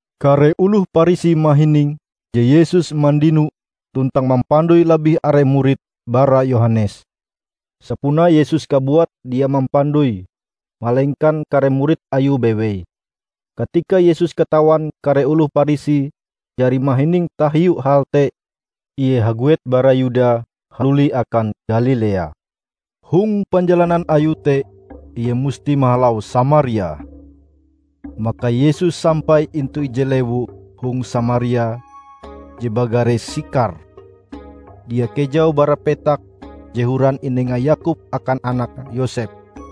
Kare oloh Parisi mahining je Yesus mandino tuntang mampandoi labih are murid bara Yohanes. ( Sapunae Yesus kabuat dia mampandoi malengkan kare murid Ayue bewei.) Katika Yesus katawan kare oloh Parisi jari mahining tahiu hal te, Ie haguet bara Yuda haluli akan Galilea. Hong panjalanan Ayue te Ie musti mahalau Samaria. Maka Yesus sampai intu ije lewu hong Samaria je bagare Sikhar, dia kejau bara petak je horan inenga Yakob akan anake Yosep.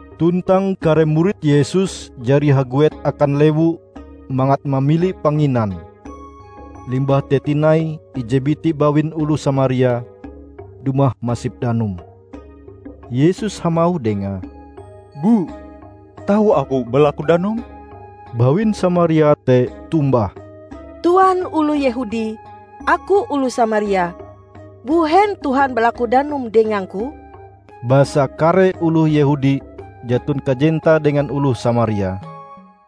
Tuntang kare murid Yesus jari haguet akan lewu mangat mamili panginan. Limbah te tinai ije biti bawin oloh Samaria dumah masip danum. Yesus hamauh dengae, "Bu, tau Aku balaku danum?" Bawin Samaria te tombah, "Tuan oloh Yehudi, aku oloh Samaria; mbuhen Tuan balaku danum dengangku?" (Basa kare oloh Yehudi jaton kajentae dengan oloh Samaria.)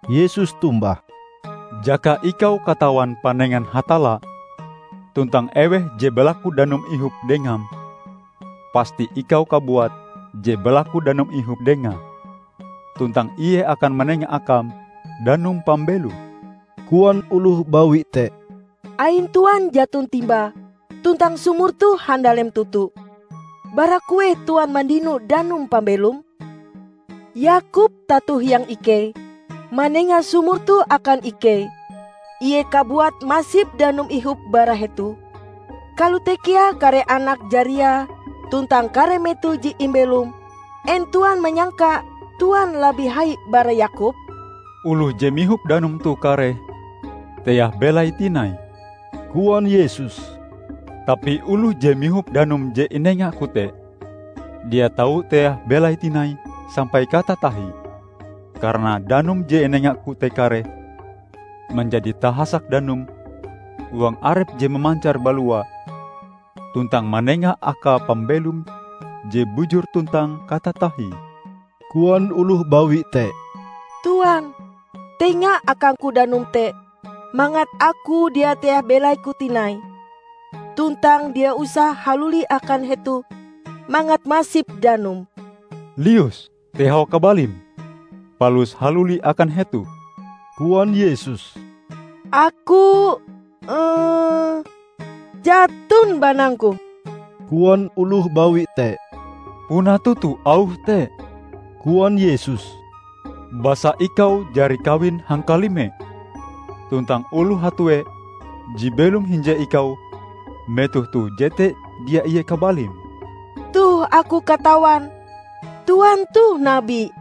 Yesus tombah, "Jaka ikau katawan panengan Hatalla tuntang eweh je balaku danum ihop dengam, pasti ikau kabuat je balaku danum ihop Dengae, tuntang Ie akan manenga akam danum pambelom." Koan oloh bawi te, "Ain Tuan jaton timba, tuntang sumur toh handalem toto. Bara kueh Tuan mandino danum pambelom? Yakob, tato hiang ikei, manenga sumur toh akan ikei. Ie kabuat masip danum ihop bara hetoh; kalote kea kare anak jariae tuntang kare meto je imbelome. En Tuan manyangka Tuan labih hai bara Yakob?" "Oloh je mihop danum toh kareh teah belaie tinai," koan Yesus, "tapi oloh je mihop danum je inenga-Ku te, dia tau teah belaie tinai sampai katatahie. Karana danum je inenga-Ku te kareh manjadi tahasak danum huang arepe je mamancar balua tuntang manenga akae pambelom je bujur tuntang katatahie." Koan oloh bawi te, "Tuan, tenga akangku danum te, mangat aku dia teah belaiku tinai; tuntang dia usah haluli akan hetoh mangat masip danum." "Lius, tehau kabalim, palus haluli akan hetoh," koan Yesus. "Aku jaton banangku," koan oloh bawi te. "Puna toto auhm te," koan Yesus. "Basa ikau jari kawin hangkalime tuntang oloh hatue je belom hinje ikau metoh toh jete dia ie kabalim." "Toh aku katawan Tuan toh nabi,"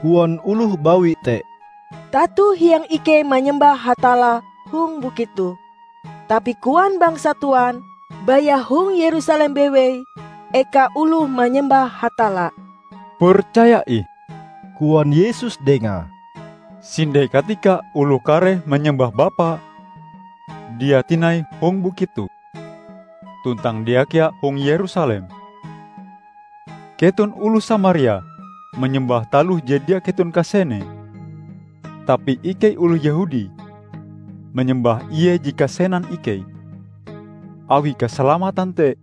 koan oloh bawi te. "Tato hiang ikei manyembah Hatalla hong bukit toh, tapi koan bangsa Tuan, baya hong Yerusalem bewei eka oloh manyembah Hatalla." "Percaya ih," koan Yesus dengae, "sinde katika oloh kareh manyembah Bapa, dia tinai hong Bukit toh, tuntang dia kea hong Yerusalem. Keton oloh Samaria manyembah taloh je dia keton kasenee, tapi ikei oloh Yehudi manyembah Ie je kasenan ikei, awi kasalamatan te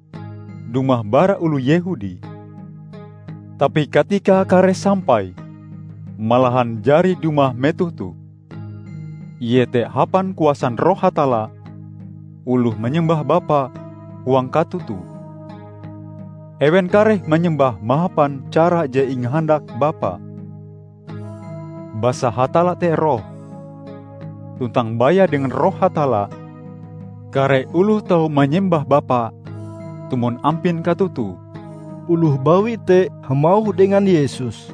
dumah bara oloh Yehudi. Tapi katikae kareh sampai, malahan jari dumah metoh toh, iete hapan kuasan Roh Hatalla oloh manyembah Bapa huang katoto. Ewen kareh manyembah mahapan cara je ingahandak Bapa. Basa Hatalla te Roh, tuntang baya dengan Roh Hatalla, kare oloh tau manyembah Bapa tumon ampin katotoe." Oloh bawi te hamauh dengan Yesus,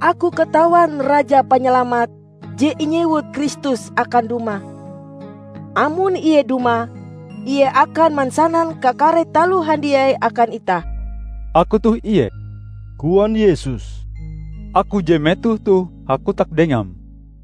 "Aku katawan Raja Panyalamat (je inyewut Kristus) akan dumah. Amon Ie dumah, Ie akan mansanan kakare taloh handiai akan itah." "Aku toh Ie," koan Yesus, "Aku je metoh toh hakotak dengam."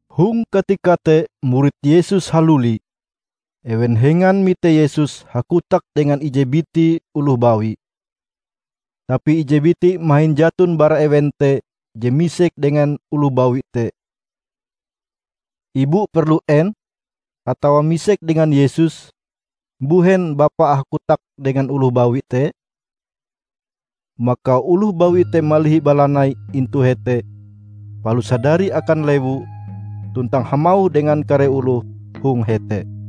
Hong katika te murid Yesus haluli. Ewen hengan mite Yesus hakotak dengan ije biti oloh bawi. Tapi ije biti mahin jaton bara ewen te je misek dengan oloh bawi te, "Ibu perlu en?" atawa misek dengan Yesus, "Mbuhen bapa hakotak dengan oloh bawi te?" Maka oloh bawi te malihi balanaie intu hete palus hadari akan lewu tuntang hamauh dengan kare oloh hong hete,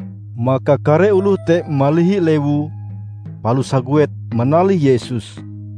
Maka kare oloh te malihi lewu palus haguet manalih Yesus.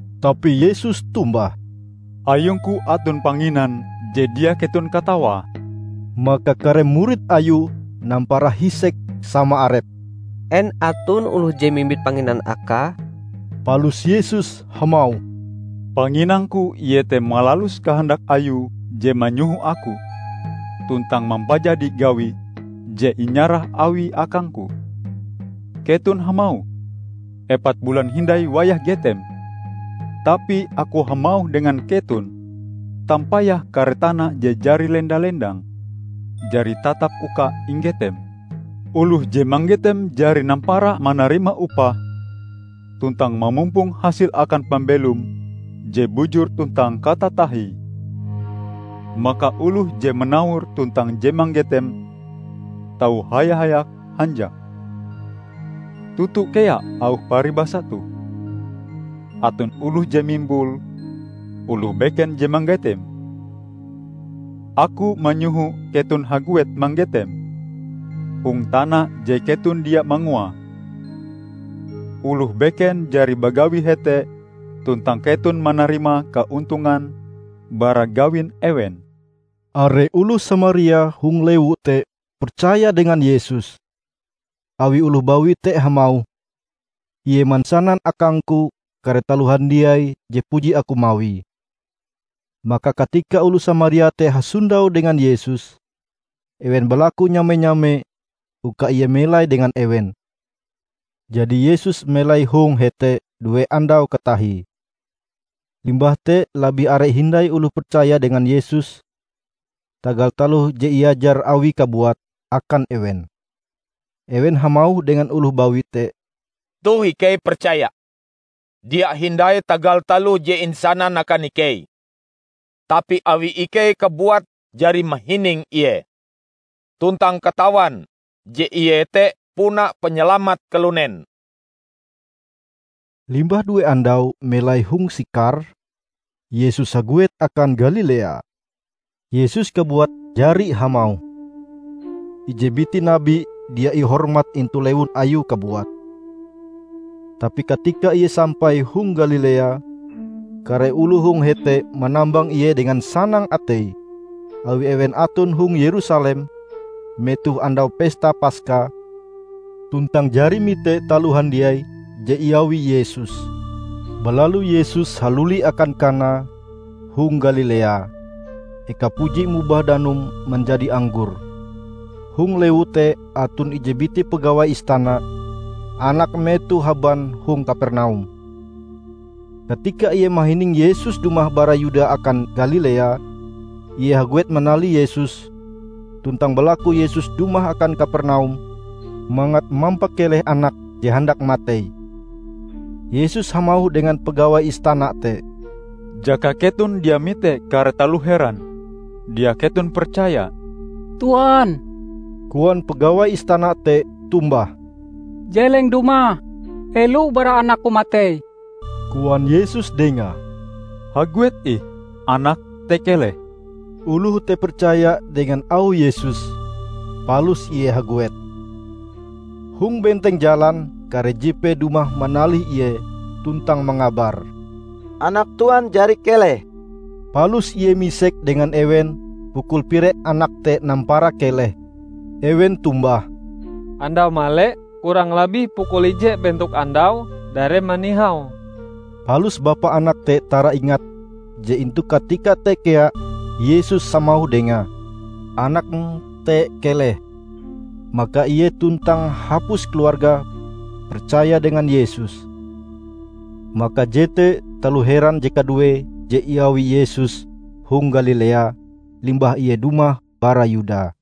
Tapi Yesus tombah, "Ayung-Ku aton panginan je dia keton katawae." Maka kare murid Ayue nampara hisek sama arepe, "En aton oloh je mimbit panginan Akae?" Palus Yesus hamauh, "Panginang-Ku iete malalus kahandak Ayue je manyoho Aku, tuntang mampajadi gawi je inyarah Awie akang-Ku. Keton hamauh, 'Epat bulan hindai wayah getem.' Tapi Aku hamauh dengan keton: Tampayah kare tana je jari lenda-lendang, jari tatap uka inggetem! Oloh je manggetem jari nampara manarima upahe tuntang mamumpong hasil akan pambelom je bujur tuntang katatahie. Maka oloh je manawor tuntang je manggetem tau haya-hayak hanjak. Toto kea auh paribasa toh, 'Aton oloh je mimbul, oloh beken je manggetem.' Aku manyoho keton haguet manggetem hong tana je keton dia manguae; oloh beken jari bagawi hete tuntang keton manarima kaontongan bara gawin ewen." Are oloh Samaria hong lewu te percaya dengan Yesus, awi oloh bawi te hamauh, 'Ie mansanan akangku kare taloh handiai je puji aku mawie.' Maka katika oloh Samaria te hasondau dengan Yesus, ewen balaku nyame-nyame uka Ie melai dengan ewen. Jadi Yesus melai hong hete due andau katahie. Limbah te labih are hindai oloh percaya dengan Yesus tagal taloh je iajar Awie kabuat akan ewen. Ewen hamauh dengan oloh bawi te, "Toh ikei percaya, dia hindai tagal taloh je insanam akan ikei, tapi awi ikei kabuat jari mahining Ie, tuntang katawan je Ie te puna Panyalamat kalunen." Limbah due andau melai hong Sikhar, Yesus haguet akan Galilea. Yesus kabuat jari hamauh, "Ije biti nabi dia ihormat intu lewun ayue kabuat." Tapi katika Ie sampai hong Galilea, kare oloh hong hete manambang Ie dengan sanang atei, awi ewen aton hong Yerusalem metoh Andau Pesta Paska, tuntang jari mite taloh handiai je iawi Yesus. Balalu Yesus haluli akan Kana hong Galilea, ekae puji mobah danum manjadi anggor. Hong lewu te aton ije biti pagawai istana; anake metoh haban hong Kapernaum. Katika ie mahining Yesus dumah bara Yuda akan Galilea, ie haguet manalih Yesus tuntang balaku Yesus dumah akan Kapernaum mangat mampakeleh anake je handak matei. Yesus hamauh dengan pagawai istana te, "Jaka keton dia mite kare taloh heran, dia keton percaya." "Tuan," koan pagawai istana te tombah, "Jeleng dumah helo bara anakku matei." Koan Yesus dengae, "Haguet ih anakm te keleh." Oloh te percaya dengan auh Yesus, palus ie haguet. Hong benteng jalan, kare jipee dumah manalih ie tuntang mangabar, "Anak Tuan jari keleh." Palus ie misek dengan ewen pukul pire anak te nampara keleh. Ewen tombah, "Andau male kurang labih pukul ije bentok andau dareme nihau." Palus bapa anak te taraingat je intu katika te kea Yesus hamauh dengae, "Anakm te keleh." Maka ie tuntang hapus keluargae percaya dengan Yesus. Maka jete taloh heran je kaduee je iawi Yesus hong Galilea limbah Ie dumah bara Yuda.